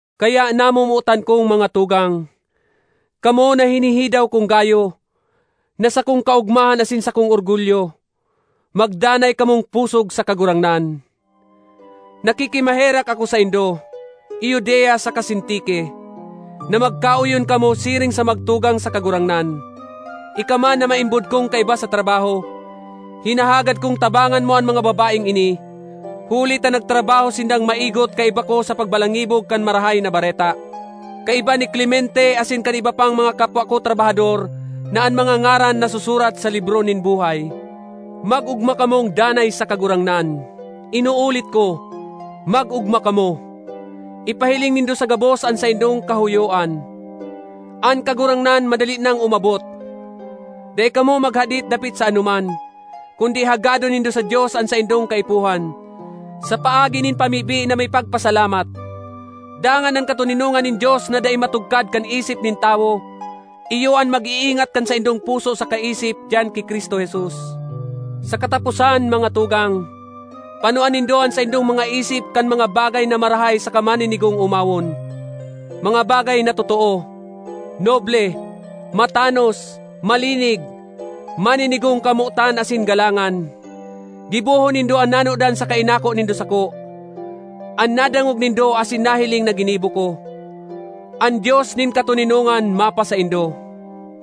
Kaya namomotan kong mga tugang, kamo na hinihidaw kong gayo, na sakong kaogmahan asin sakong orgulyo, magdanay kamong pusog sa Kagurangnan. Nakikimaherak ako saindo, Euodia saka Sintique, na magkaoyon kamo siring sa magtugang sa Kagurangnan. Ika man na maimbod kong kaiba sa trabaho, hinahagad kong tabangan mo an mga babaeng ini, huli ta nagtrabaho sindang maigot kaiba ko sa pagbalangibog kan Marahay na Bareta, kaiba ni Clemente asin kan iba pang mga kapwa ko trabahador na an mga ngaran nasusurat sa libro nin buhay. Mag-ogma kamong danay sa Kagurangnan. Inuulit ko, mag-ogma kamo! Ipahiling nindo sa gabos an saindong kahoyoan. An Kagurangnan madali nang umabot. Dai kamo maghadit dapit sa anoman, kundi hagadon nindo sa Dios an saindong kaipuhan, sa paagi nin pamibi na may pagpasalamat. Dangan an katoninongan nin Dios na dai matugkad kan isip nin tawo iyo an mag-iingat kan saindong puso saka isip diyan ki Cristo Jesus. Sa kataposan, mga tugang, panoa nindo an saindong mga isip kan mga bagay na marahay saka maninigong omawon: mga bagay na totoo, noble, matanos, malinig, maninigong kamotan asin galangan. Gibohon nindo an nanodan saka inako nindo sako, an nadangog nindo asin nahiling na ginibo ko. An Dios nin katoninongan mapasaindo.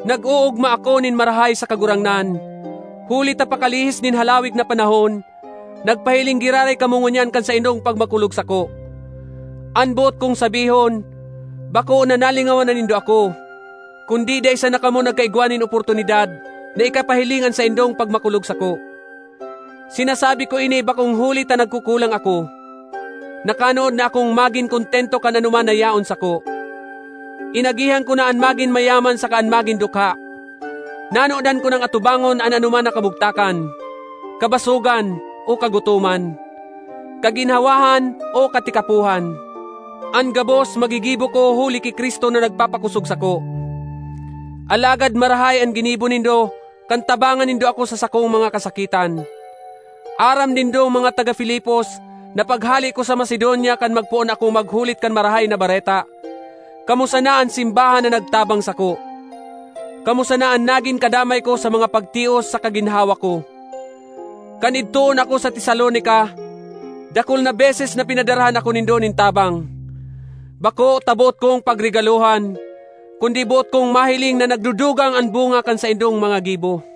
Nag-oogma ako nin marahay sa Kagurangnan huli ta pakalihis nin halawig na panahon, nagpahiling giraray kamo ngunyan kan saindong pagmakulog sako. An boot kong sabihon, bako na nalingawan na nindo ako, kundi dai sana kamo nagkaigwa nin oportunidad na ikapahiling an saindong pagmakulog sako. Sinasabi ko ini bakong huli ta nagkukulang ako; nakanood na akong magin kontento kan anoman na yaon sako. Inagihan ko na an magin mayaman saka an magin dukha. Nanodan ko nang atubangon an anoman na kamugtakan, kabasogan o kagutoman, kaginhawahan o katikapohan. An gabos magigibo ko huli ki Cristo na nagpapakosog sako. Alagad marahay an ginibo nindo kan tabangan nindo ako sa sakong mga kasakitan. Aram nindong mga taga Filipos na paghale ko sa Macedonia kan magpoon akong maghulit kan Marahay na Bareta, kamo sana an simbahan na nagtabang sako; kamo sana an nagin kadamay ko sa mga pagtios saka ginhawa ko. Kan idtoon ako sa Tesalonica, dakul na beses na pinadarahan ako nindo nin tabang. Bako ta boot kong pagregalohan, kundi boot kong mahiling na nagdudugang an bunga kan saindong mga gibo.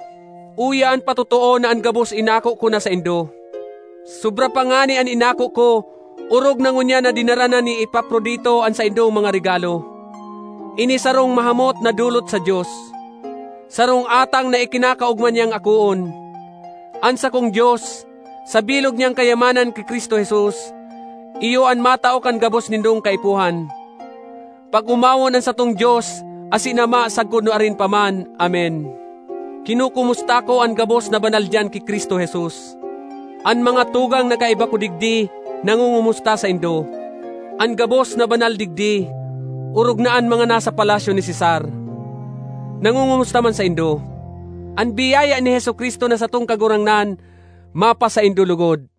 Uya an patotoo na an gabos inako ko na saindo; sobra pa ngani an inako ko orog na ngunyan na dinara na ni Epaprodito an saindong mga regalo. Ini sarong mahamot na dolot sa Dios, sarong atang na ikinakaogma niyang akoon. An sakong Dios, sa bilog niyang kayamanan ki Cristo Jesus, iyo an matao kan gabos nindong kaipuhan. Pag-omawon an satong Dios asin Ama sagkod nuarin pa man! Amen. Kinokomusta ko an gabos na banal diyan ki Cristo Jesus. An mga tugang na kaiba ko digdi nangongomusta saindo. An gabos na banal digdi, orog na an mga nasa palasyo ni Cesar, nangongomusta man saindo. An biyaya ni Jesu-Cristo na satong Kagurangnan mapasaindo logod.